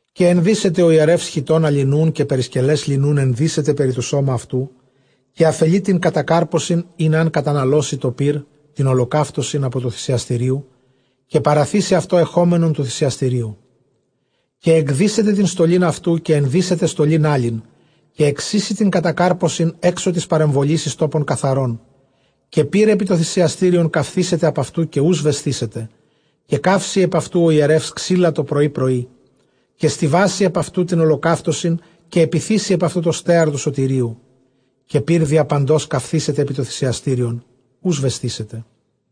Καὶ ἐνδύσεται ὁ ἱερεὺς χιτῶνα λινοῦν, καὶ περισκελὲς λινοῦν ἐνδύσεται περὶ τὸ σῶμα αὐτοῦ, καὶ ἀφελεῖ τὴν κατακάρπωσιν, ἣν ἂν καταναλώσῃ τὸ πῦρ, τὴν ὁλοκαύτωσιν ἀπὸ τοῦ θυσιαστηρίου· καὶ παραθήσει αὐτὸ ἐχόμενον τοῦ θυσιαστηρίου. Καὶ ἐκδύσεται τὴν στολὴν αὐτοῦ, καὶ ἐνδύσεται στολὴν ἄλλην· καὶ ἐξοίσει τὴν κατακάρπωσιν ἔξω τῆς παρεμβολῆς εἰς τόπον καθαρόν. Καὶ πῦρ ἐπὶ τὸ θυσιαστήριον καυθήσεται ἀπʼ αὐτοῦ, καὶ οὐ σβεσθήσεται· καὶ καύσει ἐπʼ αὐτοῦ ὁ ἱερεὺς ξύλα τοπρωῒ πρωῒ, καὶ στοιβάσει ἐπʼ αὐτοῦ τὴν ὁλοκαύτωσιν, καὶ ἐπιθήσει ἐπʼ αὐτὸ τὸ στέαρ τοῦ σωτηρίου. Καὶ πῦρ διαπαντὸς καυθήσεται ἐπὶ τὸ θυσιαστήριον, οὐ σβεσθήσεται.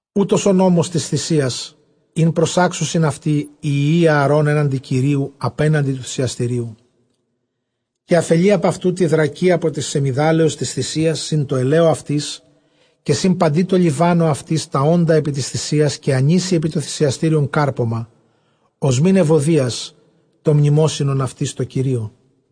Οὗτος ὁ νόμος τῆς θυσίας, ἣν προσάξουσιν αὐτὴν οἱ υἱοὶ Ἀαρὼν ἔναντι Κυρίου, ἀπέναντι τοῦ θυσιαστηρίου. Καὶ ἀφελεῖ ἀπʼ αὐτοῦ τῇ δρακὶ ἀπὸ τῆς σεμιδάλεως τῆς θυσίας σὺν τῷ ἐλαίῳ αὐτῆς, καὶ σὺν παντὶ τῷ λιβάνῳ αὐτῆς, τὰ ὄντα ἐπὶ τῆς θυσίας· καὶ ἀνοίσει ἐπὶ τὸ θυσιαστήριον κάρπωμα ὀσμὴν εὐωδίας, τὸ μνημόσυνον αὐτῆς τῷ Κυρίῳ.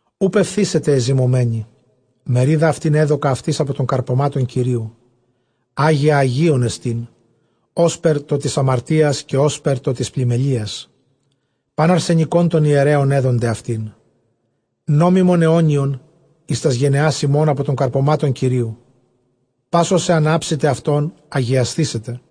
Οὐ πεφθήσεται ἐζυμωμένη· μερίδα αὐτὴν ἔδωκα αὐτοῖς ἀπὸ τῶν καρπωμάτων Κυρίου· ἅγια ἁγίων ἐστὶν, ὥσπερ τὸ τῆς ἁμαρτίας, καὶ ὥσπερ τὸ τῆς πλημμελείας. Πᾶν ἀρσενικὸν τῶν ἱερέων ἔδονται αὐτήν· νόμιμον αἰώνιον εἰς τὰς γενεὰς ὑμῶν ἀπὸ τῶν καρπωμάτων Κυρίου· πᾶς ὃς ἐὰν ἅψηται αὐτῶν, ἁγιασθήσεται.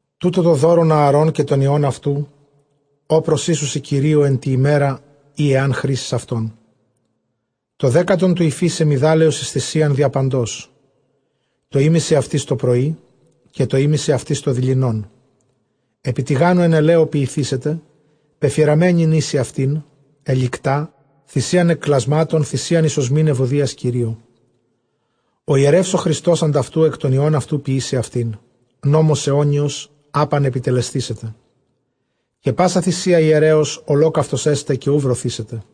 τοῦτο τὸ δῶρον Ἀαρὼν καὶ τῶν υἱῶν αὐτοῦ, ὃ προσοίσουσι Κυρίῳ ἐν τῇ ἡμέρᾳ, ᾗ ἂν χρίσῃς αὐτόν· τὸ δέκατον τοῦ οἰφὶ σεμιδάλεως εἰς θυσίαν διαπαντὸς, τὸ ἥμισυ αὐτῆς τὸπρωῒ, καὶ τὸ ἥμισυ αὐτῆς τοδειλινόν. Ἐπὶ τηγάνου ἐν ἐλαίῳ ποιηθήσεται, πεφυραμένην οἴσει αὐτήν ἑλικτά, θυσίαν ἐκ κλασμάτων, θυσίαν εἰς ὀσμὴν εὐωδίας Κυρίῳ. Ὁ ἱερεὺς ὁ χριστὸς ὁ ἀντʼ αὐτοῦ ἐκ τῶν υἱῶν αὐτοῦ ποιήσει αὐτήν· νόμος αἰώνιος· ἅπαν ἐπιτελεσθήσεται. Καὶ πᾶσα θυσία ἱερέως ὁλόκαυτος ἔσται, καὶ οὐ βρωθήσεται.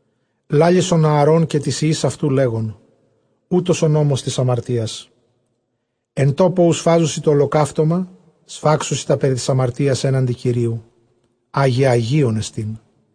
λάλησον τῷ Ἀαρὼν καὶ τοῖς υἱοῖς αὐτοῦ, λέγων, οὗτος ὁ νόμος τῆς ἁμαρτίας· ἐν τόπῳ οὗ σφάζουσι τὸ ὁλοκαύτωμα, σφάξουσι τὰ περὶ τῆς ἁμαρτίας ἔναντι Κυρίου· ἅγια ἁγίων ἐστίν.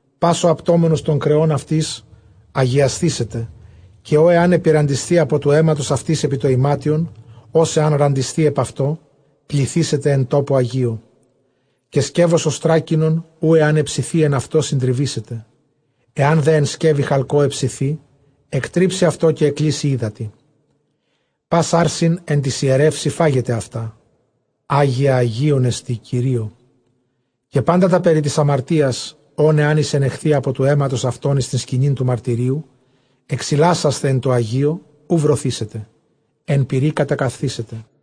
Πᾶς ὁ ἁπτόμενος τῶν κρεῶν αὐτῆς, ἁγιασθήσεται· καὶ ᾧ ἐὰν ἐπιῤῥαντισθῇ ἀπὸ τοῦ αἵματος αὐτῆς ἐπὶ τὸ ἱμάτιον, ὃς ἐὰν ῥαντισθῇ ἐπʼ αὐτὸ, πλυθήσεται ἐν τόπῳ ἁγίῳ. Καὶ σκεῦος ὀστράκινον, οὗ ἐὰν ἑψεθῇ ἐν αὐτῷ, συντριβήσεται· ἐὰν δὲ ἐν σκεύει χαλκῷ ἑψηθῇ, ἐκτρίψει αὐτὸ, καὶ ἐκκλύσει ὕδατι. Πᾶς ἄρσην ἐν τοῖς ἱερεῦσιν φάγεται αὐτά ἅγια ἁγίων ἐστὶ Κυρίῳ. Καὶ πάντα τὰ περὶ τῆς ἁμαρτίας, ὧν ἐὰν εἰσενεχθῇ ἀπὸ τοῦ αἵματος αὐτῶν εἰς τὴν σκηνὴν τοῦ μαρτυρίου ἐξιλάσασθαι ἐν τῷ ἁγίῳ, οὐ βρωθήσεται· ἐν πυρὶ κατακαυθήσεται.